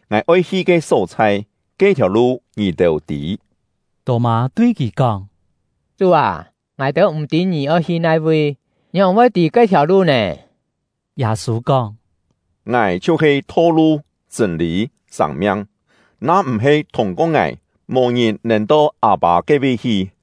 Ngài oi hi ke só-chhai, ke-thiàu lu ngì-têu tî.” Tô-mâ tui kì kóng: “Chú â, ngài-têu m̀ tî ngì oi hi nai-vi, ngióng voi tî ke-thiàu lu nè?” Yâ-sû kóng: “Ngài chhiu-he tho-lu, chṳ̂n-lî, sâng-miang; na-m̀-he thûng-ko ngài, mò ngìn nèn to Â-pâ ke-vi hi.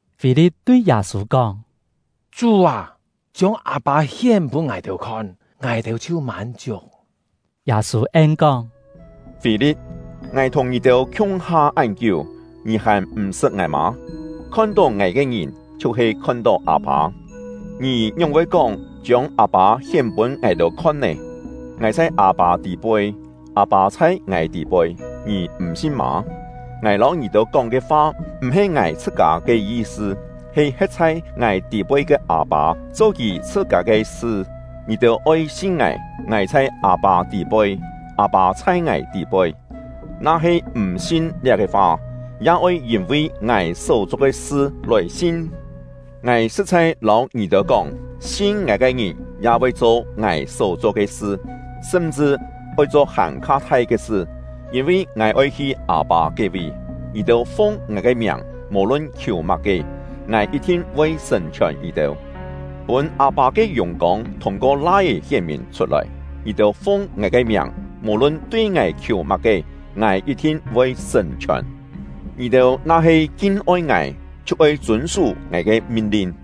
Fî-li̍t tui Yâ-sû kóng: “Chú â, chiông Â-pâ hién pûn ngài-têu khon, ngài-têu chhiu mân-chiuk.” Yâ-sû en-kóng: “Fî-li̍t, ngài thùng ngì-têu khiung-ha án kiú, ngì hàn m̀-sṳt ngài mâ? Khon-tó ngài ke ngìn, chhiu-he khon-tó Â-pâ. Ngì ngióng voi kóng ‘Chiông Â-pâ hién pûn ngài-têu khon’ nè? Ngài chhai Â-pâ tî-poi, Â-pâ chhai ngài tî-poi, ngì m̀ sin mâ? Ngài lâu ngì-têu kóng ke fa m̀-he ngài chhṳ-kâ ke yi-sṳ, he he̍t chhai ngài tî-poi ke Â-pâ cho Kì chhṳ-kâ ke sṳ. Ngì-têu oi sin ngài, ngài chhai Â-pâ tî-poi, Â-pâ chhai ngài tî-poi; na-he m̀ sin liá-ke fa, ya oi yîn-vi ngài só-cho ke sṳ lòi sin. Ngài sṳ̍t-chhai lâu ngì-têu kóng, sin ngài ke ngìn ya voi cho ngài só-cho ke sṳ, sṳm-chṳ oi cho hàn-kha thai ke sṳ; yîn-vi ngài oi hi Â-pâ ke-vi. Ngì-têu fung ngài ke miàng, mò-lun khiù má-ke, ngài yit-thin voi sṳ̀n-chhiòn ngì-têu, pûn Â-pâ ke yùng-kông thûng-ko Lai-é hién-mìn chhut-lòi. Ngì-têu fung ngài ke miàng, mò-lun tui ngài khiù má-ke, ngài yit-thin voi sṳ̀n-chhiòn. “Ngì-têu na-he kin-oi ngài, chhiu oi chûn-sú ngài ke min-lin.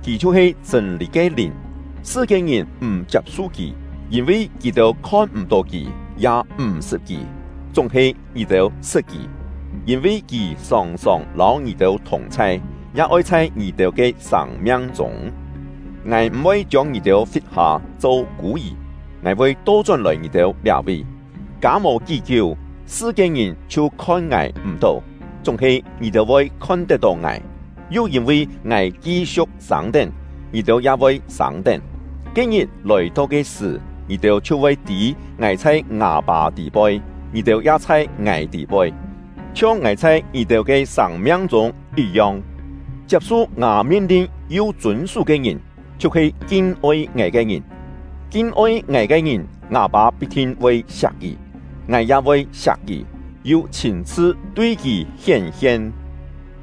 Kì chhiu-he chṳ̂n-lî ke Lìn. Sṳ-kiên-ngìn m̀ chiap-su Kì, yîn-vi kì-têu khon-m̀-tó Kì, ya m̀-sṳt Kì. Chúng-he ngì-têu sṳt Kì, yîn-vi Kì sòng-sòng lâu ngì-têu thùng-chhai, ya oi chhai ngì-têu ke sâng-miang-chûng. “Ngài m̀-voi chiông ngì-têu fit-hâ cho kû-yì, ngài voi to-chón-lòi ngì-têu liá-vi. Kâ mò kí-kiú, sṳ-kiên-ngìn chhiu khon ngài m̀-tó, chúng-he ngì-têu voi khon-tet-tó ngài, yu yîn-vi ngài ki-siu̍k sâng-tén, ngì-têu ya voi sâng-tén. Ke-ngit lòi-to ke sṳ̀, ngì-têu chhiu voi tî ngài chhai ngâ Pâ tî-poi, ngì-têu ya chhai ngài tî-poi, chhiong ngài chhai ngì-têu ke sâng-miang-chûng yit-yong. “Chiap-su ngâ min-lin yu chûn-sú ke ngìn, chhiu-he kin-oi ngài ke ngìn. Kin-oi ngài ke ngìn, ngâ Pâ pit-thin voi siak kì; ngài ya voi siak kì, yu chhîn-chhṳ tui kì hién-hien.”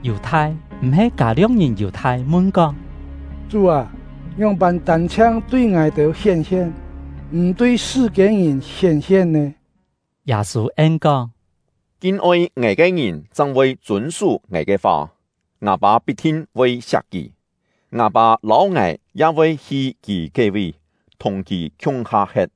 Yù-thai (m̀-he Kâ-lio̍k-ngìn Yù-thai) mun-kóng: “Chú â, ngióng-pân tân-chhiang tui ngài-têu hién-hien, m̀ tui sṳ-kiên-ngìn hién-hien nè?” Yâ-sû en-kóng: “Kin-oi ngài ke ngìn chang voi chûn-sú ngài ke fa. Ngâ Pâ pit-thin voi siak kì; ngâ Pâ lâu ngài ya voi hi kì ke-vi, thùng kì khiung-ha he̍t.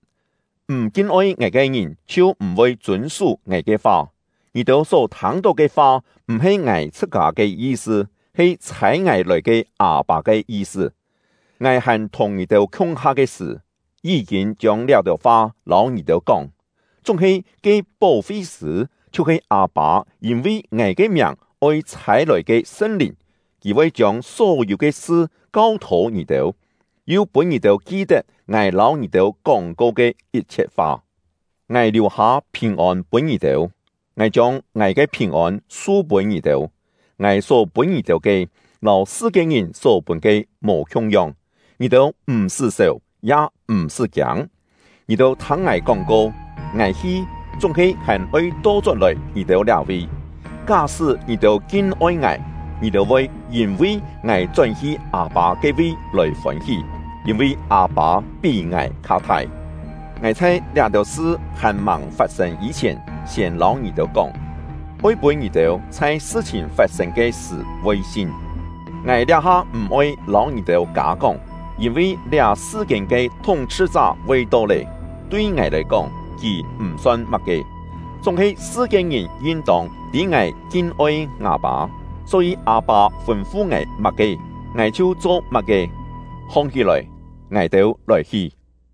M̀ kin-oi ngài ke ngìn chhiu m̀-voi chûn-sú ngài ke fa. Ngì-têu só thâng-tó ke fa m̀-he ngài chhṳ-kâ ke yi-sṳ, he chhâi ngài lòi ke Â-pâ ke yi-sṳ. “Ngài hàn thùng ngì-têu khiung-ha ke sṳ̀, yí-kîn chiông liá-têu fa lâu ngì-têu kóng. Chúng-he ke Pó-fi-sṳ̂, chhiu-he Â-pâ yîn-vi ngài ke miàng oi chhâi-lòi ke Sṳn-Lìn, Kì voi chiông só-yû ke sṳ kau-thô ngì-têu, yu pûn ngì-têu ki-tet ngài lâu ngì-têu kóng-ko ke yit-chhiet fa. “Ngài liù-hâ phìn-ôn pûn ngì-têu; ngài chiông ngài ke phìn-ôn su-pûn ngì-têu. Ngài só pûn ngì-têu ke, lâu sṳ-kiên-ngìn só pûn ke mò khiung-yong. Ngì-têu m̀-sṳ́ sèu, ya m̀-sṳ́ kiâng. Ngì-têu thâng ngài kóng-ko: ‘Ngài hi, chúng-he hàn-oi to-chón-lòi ngì-têu liá-vi.’ Ká-sṳ́ ngì-têu kin-oi ngài, ngì-têu voi yîn-vi ngài chón-hi Â-pâ ke-vi lòi fôn-hí, yîn-vi Â-pâ pí ngài kha thai. Ngài chhai liá-têu sṳ hàn-màng fat-sên yî-chhièn siên lâu ngì-têu kóng, oi pûn ngì-têu chhai sṳ-chhìn fat-sên ke sṳ̀ voi sin. Ngài liá-ha m̀-oi lâu ngì-têu kâ-kóng, yîn-vi liá sṳ-kiên ke thúng-chhṳ-chá voi to lé. Tui ngài lòi kóng, kì m̀ son má-ke; chúng-he sṳ-kiên-ngìn yin-tông tî ngài kin-oi ngâ Pâ, só-yî Â-pâ fûn-fu ngài má-ke, ngài chhiu cho má-ke. “Hong-hí-lòi, ngài-têu lòi-hi!”